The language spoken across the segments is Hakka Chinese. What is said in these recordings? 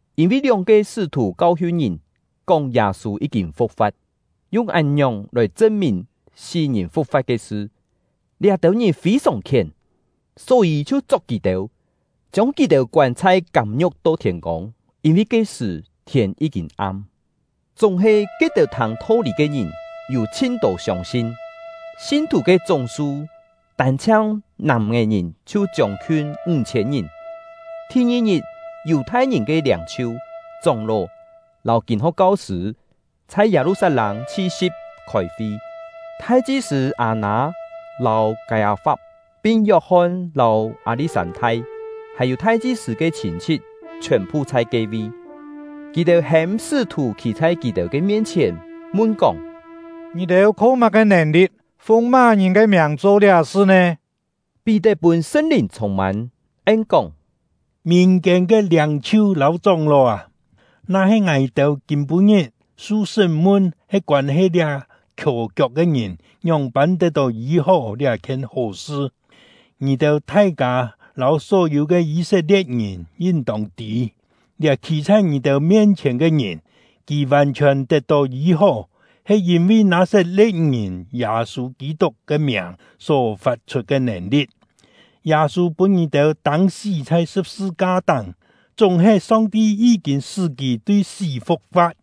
Yîn-vi lióng-ke sṳ́-thù kau-hiun ngìn, kóng Yâ-sû yí-kîn fu̍k-fa̍t, yung án-ngiòng lòi chṳn-mìn sí-ngìn fu̍k-fa̍t ke sṳ, liá-têu ngìn fî-sòng khién, só-yî chhiu chok kì-têu, chiông kì-têu koân chhai kâm-ngiu̍k to thiên-kông, yîn-vi ke-sṳ̀ thiên yí-kîn am. Chúng-he, ke-têu thâng tho-lî ke ngìn yû chhin-tô siông-sin; sin-thù ke chúng-su tân-chhiang nàm-é-ngìn chhiu chiông-khiun ńg-chhiên ngìn. Thi-ngi-ngit, Yù-thai-ngìn ke liâng-chhiu, chóng-ló, lâu kîn-ho̍k kau-sṳ̂ chhai Yâ-lu-sat-lâng chhi-si̍p khôi-fi. Thai-chi-sṳ̂ Â-nâ lâu Kâi-â-fap, pin Yok-hon lâu Â-li̍t-sân-thai, hàn-yû thai-chi-sṳ̂ ke chhîn-chhit chhiòn-phu chhai ke-vi. Kì-têu hêm sṳ́-thù khî chhai kì-têu ke mien-chhièn, mun-kóng: “Ngì-têu kho má-ke nèn-li̍t, fung má-ngìn ke miàng cho liá-sṳ nè?” Pí-tet pûn Sṳn-Lìn chhûng-mân, en-kóng: “Mìn-kiên ke liâng-chhiu lâu chóng-ló â, na-he ngài-têu kîm-pû-ngit su sṳ́m-mun he koân-he liá khiò-kiok ke ngìn ngióng-pân tet-tó yî-hó liá-khien hó sṳ, ngì-têu thai-kâ lâu só-yû ke Yî-set-lie̍t-ngìn yin-tông tî: Liá khî chhai ngì-têu mien-chhièn ke ngìn, kì vàn-chhiòn tet-tó yî-hó, he yîn-vi Nâ-sat-le̍t-ngìn Yâ-sû Kî-tuk ke miàng só fat-chhut ke nèn-li̍t. Yâ-sû pûn ngì-têu tâng-sí chhai sṳ̍p-sṳ-ka-táng, chúng-he Song-ti yí-kîn sṳ́ kì tui sí fu̍k-fa̍t.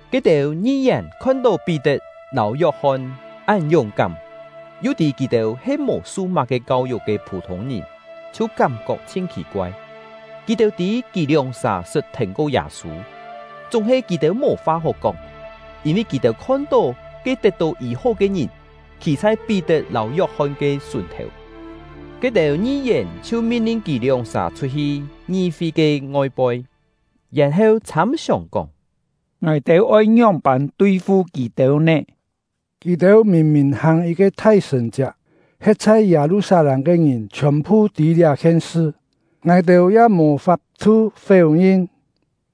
Ke-têu ngi-yèn khon-tó Pí-tet lâu Yok-hon án yúng-kám, yu tî kì-têu he mò su má-ke kau-yuk ke phû-thûng-ngìn, chhiu kám-kok chhin khì-koai. Kì-têu tî kì lióng-sà sṳt thèn-ko Yâ-sû; chúng-he, kì-têu mò fa hó kóng, yîn-vi kì-têu khon-tó ke tet-tó yî-hó ke ngìn khî chhai Pí-tet lâu Yok-hon ke sùn-thèu. Ke-têu ngi-yèn chhiu min-lin kì lióng-sà chhut-hi ngi-fi ke ngoi-poi, yèn-heu chhâm-siòng, kóng: “Ngài-têu oi ngióng-pân tui-fu kì-têu nè? Kì-têu mìn-mìn hàng yit-ke thai sṳ̀n-chiak, he̍t chhai Yâ-lu-sat-lâng ke ngìn chhiòn-phu tî liá-khien sṳ, ngài-têu ya mò fap-thu féu-ngin.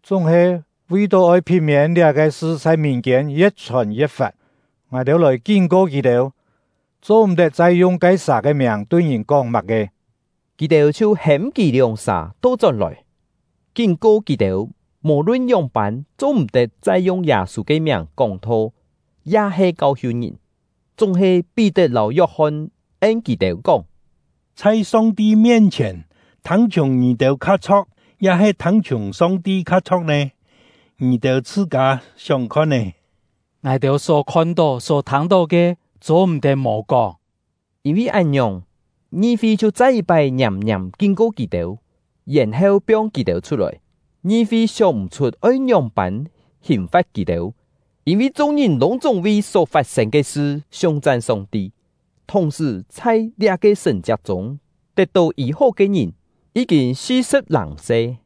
Chúng-he, vi-tó oi phit-miên liá-ke sṳ chhai mìn-kiên ye̍t-chhòn ye̍t-fat, ngài-têu lòi kín-ko kì-têu, cho-m̀-tet chai yung ke-sà ke miàng tui ngìn kóng má-ke.” Kì-têu chhiu hêm kì lióng-sà to-chón-lòi, kín-ko kì-têu mò-lun ngióng-pân cho-m̀-tet chai yung Yâ-sû ke miàng kóng-tho ya-he kau-hiun ngìn. Chúng-he Pí-tet lâu Yok-hon en kì-têu kóng: “Chhai Song-ti mien-chhièn, thâng-chhiùng ngì-têu kha chho̍k, ya-he thâng-chhiùng Song-ti kha chho̍k nè? Ngì-têu chhṳ-kâ sióng khon-é! Ngài-têu só khon-tó, só thâng-tó ke, cho-m̀-tet mò kóng.” Yîn-vi án-ngiòng, ngi-fi chhiu chai yit-pái ngiàm-ngiàm kín-ko kì-têu, yèn-heu piong kì-têu chhut-lòi. Ngi-fi sióng-m̀-chhut oi ngióng-pân hìn-fa̍t kì-têu, yîn-vi chung-ngìn lûng-chúng vi só fat-sên ke sṳ siung-chan Song-ti. Thùng-sṳ̀, chhai liá-ke sṳ̀n-chiak chûng tet-tó yî-hó ke ngìn yí-kîn si-sṳ̍p-làng se.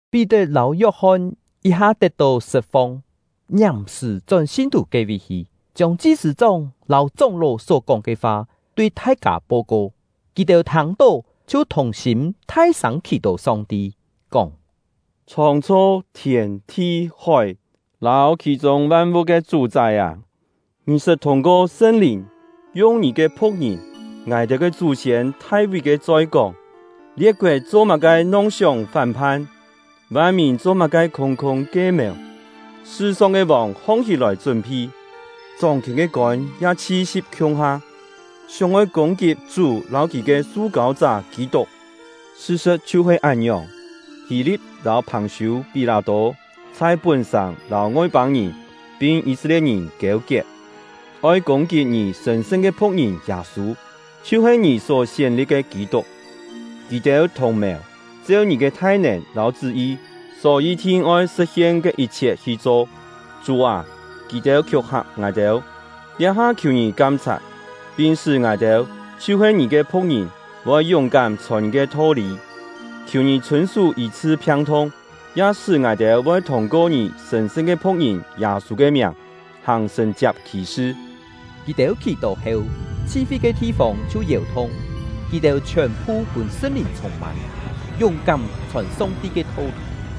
Pí-tet lâu Yok-hon yit-ha tet-tó sṳt-fong, ngiàm-sṳ̀ chón sin-thù ke-vi hi, chiông chi-sṳ̂-chóng lâu chóng-ló só-kóng ke fa tui thai-kâ po-ko. Kì-têu thâng-tó, chhiu thùng-sîm thai-sâng khì-tó Song-ti, kóng: “Chhóng-chho thiên, thi, hói, lâu khì-chûng van-vu̍t ke Chú-chái â! Ngì sṳt thûng-ko Sṳn-Lìn, yung Ngì ke phu̍k-ngìn — ngài-têu ke chú-siên Thai-ví ke choi kóng: Lie̍t-koet cho-má-ke nong-sióng fán-phan? Van-mìn cho-má-ke khûng-khûng kie-mèu? Sṳ-song ke vòng hong-hí-lòi chún-phi; chóng-khièn ke kôn ya chhi-si̍p khiung-ha, sióng-oi kûng-kit Chú lâu Kì ke Su-kâu-chá Kî-tuk. Sṳ-sṳ̍t chhiu-he án-ngiòng, Hî-li̍t lâu Phàng-siû-Pí-lâ-tô chhai pún-sàng lâu Ngoi-pâng-ngìn pin Yî-set-lie̍t-ngìn kiêu-kiet, oi kûng-kit Ngì sṳ̀n-sṳn ke phu̍k-ngìn Yâ-sû, chhiu-he Ngì só sién-li̍p ke Kî-tuk. Kì-têu thùng-mèu, cheu Ngì ke thai-nèn lâu chṳ́-yi só yi-thin oi sṳ̍t-hien ke yit-chhiet hi cho. Chú â, kì-têu khiúng-hak ngài-têu, liá-ha khiù Ngì kam-chhat, pin sṳ́ ngài-têu, chhiu-he Ngì ke phu̍k-ngìn, voi yúng-kám chhòn Ngì ke tho-lî. Khiù Ngì chhûn-sú yî-chhṳ phiang-thung, ya sṳ́ ngài-têu voi thûng-ko Ngì sṳ̀n-sṳn ke phu̍k-ngìn Yâ-sû ke miàng hàng sṳ̀n-chiak khì-sṳ.” Kì-têu khì-tó heu, chhi-fi ke thi-fông chhiu yèu-thung; kì-têu chhiòn-phu pûn Sṳn-Lìn chhûng-mân, yúng-kám chhòn Song-ti ke tho-lî.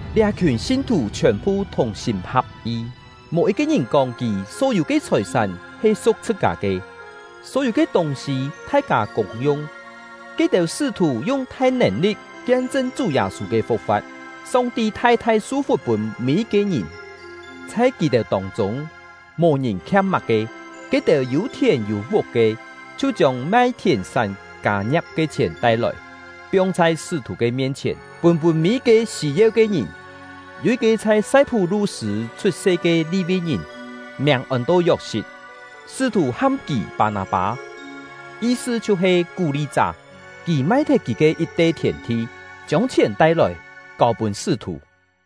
Liá-khiùn sin-thù chhiòn-phu thùng-sîm ha̍p-yi, mò yit-ke ngìn kóng kì só-yû ke chhòi-sán he su̍k chhṳ-kâ ke; só-yû ke tûng-sî thai-kâ kûng-yung. Ke-têu sṳ́-thù yung thai nèn-li̍t kien-chṳn Chú Yâ-sû ke fu̍k-fa̍t; Song-ti thai-thai su-fuk pûn mî-yit-ke ngìn. Chhai kì-têu tông-chûng, mò-ngìn khiam má-ke. Ke-têu yû thièn yû vuk ke, chhiu chiông mai thièn-sán kâ-ngia̍p ke chhièn tai-lòi, piong chhai sṳ́-thù ke mien-chhièn, pûn-pûn mî-yit-ke sî-yeu ke ngìn. Yû yit-ke chhai Sai-phú-lu-sṳ̂ chhut-se ke Li-vi-ngìn, miàng ôn-to Yok-sit, sṳ́-thù ham kì Pâ-nâ-pâ (yi-sṳ chhiu-he “Kú-li-chá”); kì mai-thet kì ke yit-te thièn-thi, chiông chhièn tai-lòi, kâu-pûn sṳ́-thù.